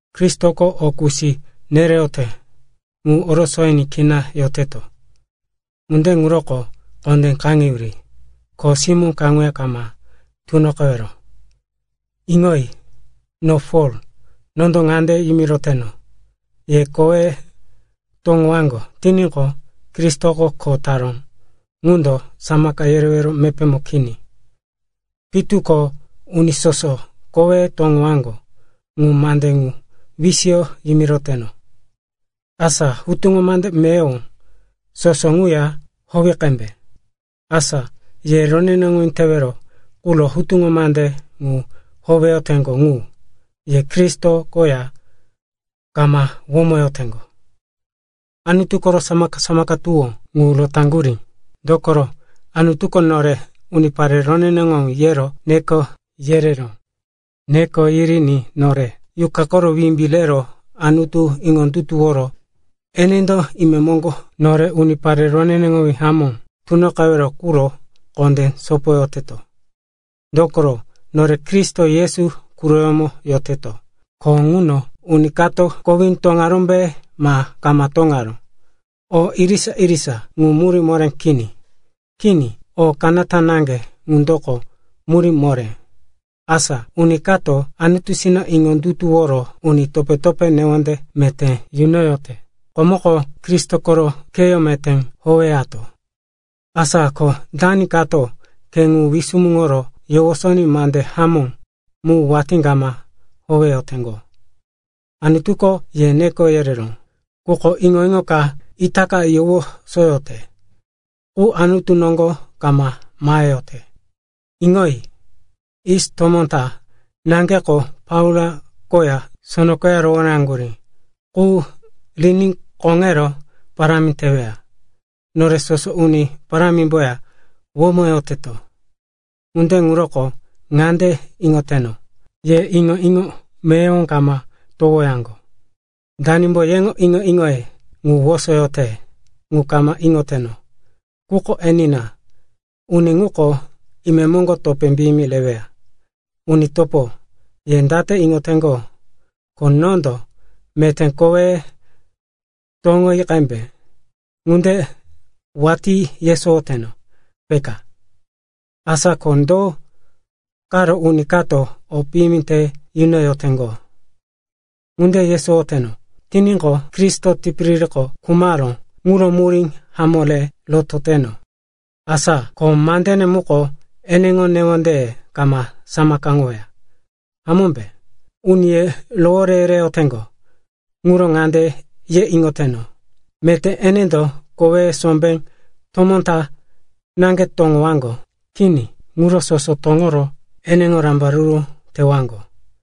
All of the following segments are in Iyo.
Kristoko o kusi nereyote ŋu orosoyiní kina yoteto. Ŋunde ŋuroko kondé kaŋeyuri. Kho simó kaŋuya ma tunoqewero. Iŋoyi. No Pol, nondo ŋande yimiroteno, ye koweye toŋowaŋgo tiníqo, Kristoko kho taró ŋundo samaka yerewero mepémo kini. Pitu ko uni soso koweye toŋowaŋgo ŋu mande ŋu wisiyo yimiroteno, asa hutuŋo mande meyowo soso ŋuya howe qembe. Asa ye roneneŋowí tewero quro hutuŋo mande ŋu howeyoteŋgo ŋu, ye Kristo koya kama womoyoteŋgo, Anutu koro samaka-samaka tuwó ŋu rotaŋgurí. Dokoro Anutuko nore, unipare roneneŋowí, yero neko yereró. Neko yiriní nore Yuqa koro wimbí rero Anutu iŋondutuworo enendo imemoŋgo nore unipare roneneŋowí hamó tunoqewero ŋuro kondé sopoyoteto. Dokoro nore Kristo Yesu quroyómo yoteto, ko ŋuno uni kato kowí toŋarómbe ma kama toŋaró, o irisa-irisa ŋu murí moré kini. Kini, o kanata na ŋundoko murí moré, asa uni kato Anutusina iŋondutuworo uni topé-topé newonde meté yunoyote. Komoko Kristo koro kheyó meté howeyate. Asa ko dani kato khe ŋu wisumuŋoro yowosoní mande hamó mu watí kama howeyoteŋgo? Anutuko ye neko yereró, quko iŋo-iŋo ka itaka yowosoyoteŋgo ŋuko Anutu koŋgo kama maheyote. Iŋoyi. Yis tomó ta naŋgeko plaua koya sono koya rohoréŋaŋgurí qu riní koŋero parámi teweya. Nore soso Uni Parámimboya womoyoteto. Ŋunde ŋuroko ŋande iŋoyoteno, ye iŋo-iŋo meyowo kama towowaŋgo. Danimbo yeŋo iŋo-iŋoye wosoyote, ŋu kama iŋoteno. Quko enina, uni ŋuko imemoŋgo topé piyimi reweya. Uni topo, ye date iŋoteŋgo, ko nondo, meté koweye toŋoyi qembe, ŋunde watí yesowoyoteno, peka? Asa ko do karo uni kato o piyimi te nunoyoteŋgo? Ŋunde yesowoyoteno tiníqo, Kristo tipiririko khumaró ŋuro murí hamó re rotoyoteno. Asa ko mandene muko eneŋo newondeye kama saŋgawoweya, hamómbe? Uni ye rowore yereyoteŋgo ŋuro ŋande ye iŋoteno, meté enendo koweye sombé tomó ta naŋge toŋowaŋgo. Kini, ŋuro soso toŋoro eneŋo rambaruru tewaŋgo.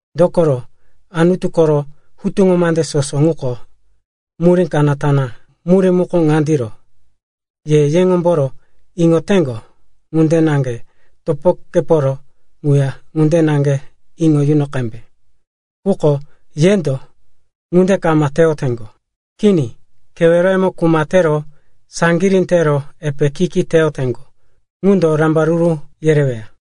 Dokoro Anutu koro hutuŋo mande soso ŋuko murí kanata na. Murí muko ŋandiro, ke keŋomboro iŋoyote ŋunde naŋge topokeporo ŋuya ŋunde naŋge iŋo yuno qembe. Quko yendo ŋunde kama teyoteŋgo. Kini, keweroyemo kuma tero saŋgirí tero epe ki-ki teyoteŋgo ŋundo rambaruru yereweya.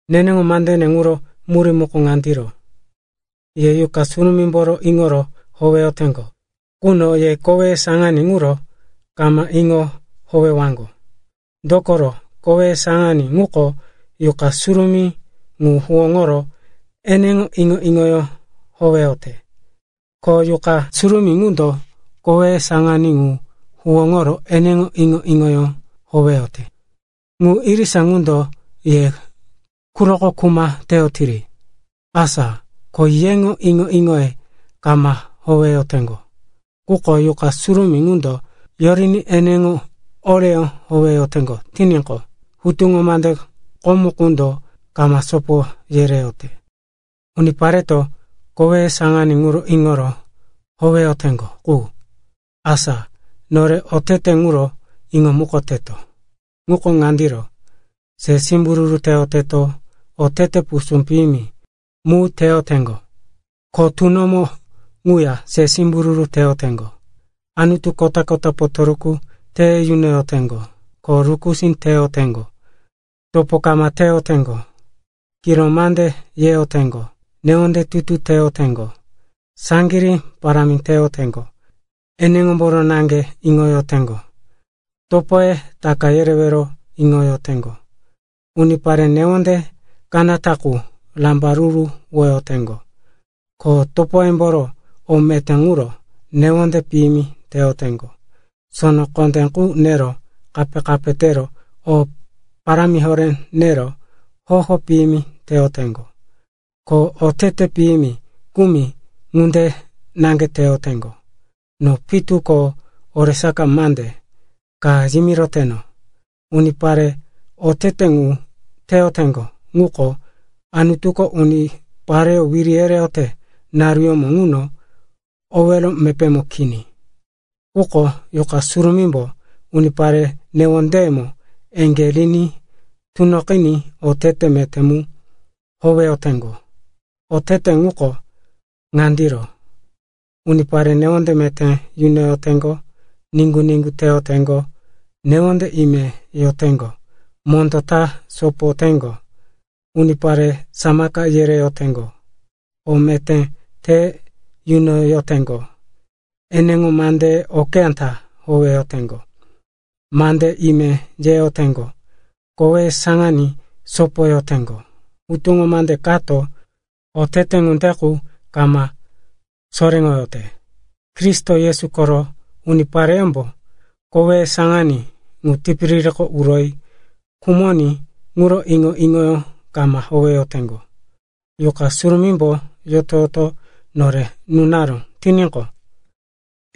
Neneŋo mandene ŋuro murí muko ŋandiro, ye Yuqa Surumímboro iŋoro howewaŋgo quno ye koweye saŋaní ŋuro kama iŋo howewaŋgo. Dokoro koweye saŋaní ŋuko Yuqa Surumí ŋu huwóŋoro eneŋo iŋo-iŋoyó howeyote. Ko Yuqa Surumí ŋundo koweye saŋaní ŋu huwóŋoro eneŋo iŋo-iŋoyó howeyote. Ŋu irisa ŋundo ye quroko kuma teyotiri. Asa ko yeŋo iŋo-iŋoye kama howeyoteŋgo. Quko Yuqa Surumí ŋundo yoriní eneŋo oreyó howeyoteŋgo tiníqo, hutuŋo mande komo qundo kama sopo yereyote. Unipareto koweye saŋaní ŋuro iŋo howeyoteŋgo qu, asa nore oteteye ŋuro iŋomukoteto. Ŋuko ŋandiro, se simbururu teyoteŋgo, otete pusú piyimi mu teyoteŋgo, ko tunomo ŋuya se simbururu teyoteŋgo; anutu kota-kota potoruku te yunoyoteŋgo, ko rukusí teyoteŋgo; topo kama teyoteŋgo, kiro mande yeyoteŋgo, newonde tutu teyoteŋgo, saŋgirí parámi teyoteŋgo, eneŋomboro naŋge iŋoyoteŋgo, topoye taka yerewero iŋoyoteŋgo, unipare newondeye kanata qu rambaruruwoyoteŋgo, ko topoyemboro o meté quro newonde piyimi teyoteŋgo; sono kondé qu nero kape-kape tero o parámi horé nero hoho piyimi teyoteŋgo, ko otete piyimi kumi ŋunde naŋge teyoteŋgo. No pitu ko oresaka mande ka yimiroteno, unipare otete ŋu teyoteŋgo ŋuko Anutuko unipareyó wiri yereyote naruyómo ŋuno owero mepémo kini. Quko Yuqa Surumímbo unipare newondeyemo eŋgé riní tunoqiní otete meté mu howeyoteŋgo. Otete ŋuko ŋandiro, unipare newonde meté yunoyoteŋgo, niŋgu-niŋgu teyoteŋgo, newonde imemo yoteŋgo, mondó ta sopoyoteŋgo, unipare samaka yereyoteŋgo, o meté te yunoyoteŋgo, eneŋo mandeye okeyá ta howeyoteŋgo, mande ime yeyoteŋgo, koweye saŋaní sopoyoteŋgo. Hutuŋo mande kato otete ŋunde qu kama soréŋoyote. Kristo Yesu koro unipareyómbo koweye saŋaní ŋu tipiririko uroyi khumoní ŋuro iŋo-iŋoyó kama howeyoteŋgo. Yuqa Surumímbo yoto-yoto nore nunaró tiníqo,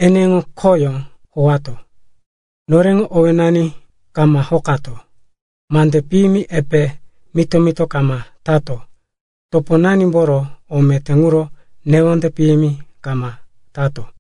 eneŋo kheyó howato. Noreŋo owénani kama hokato, mande piyimi epe mito-mito kama tato, toponanimboro o meté ŋuro newonde piyimi kama tato.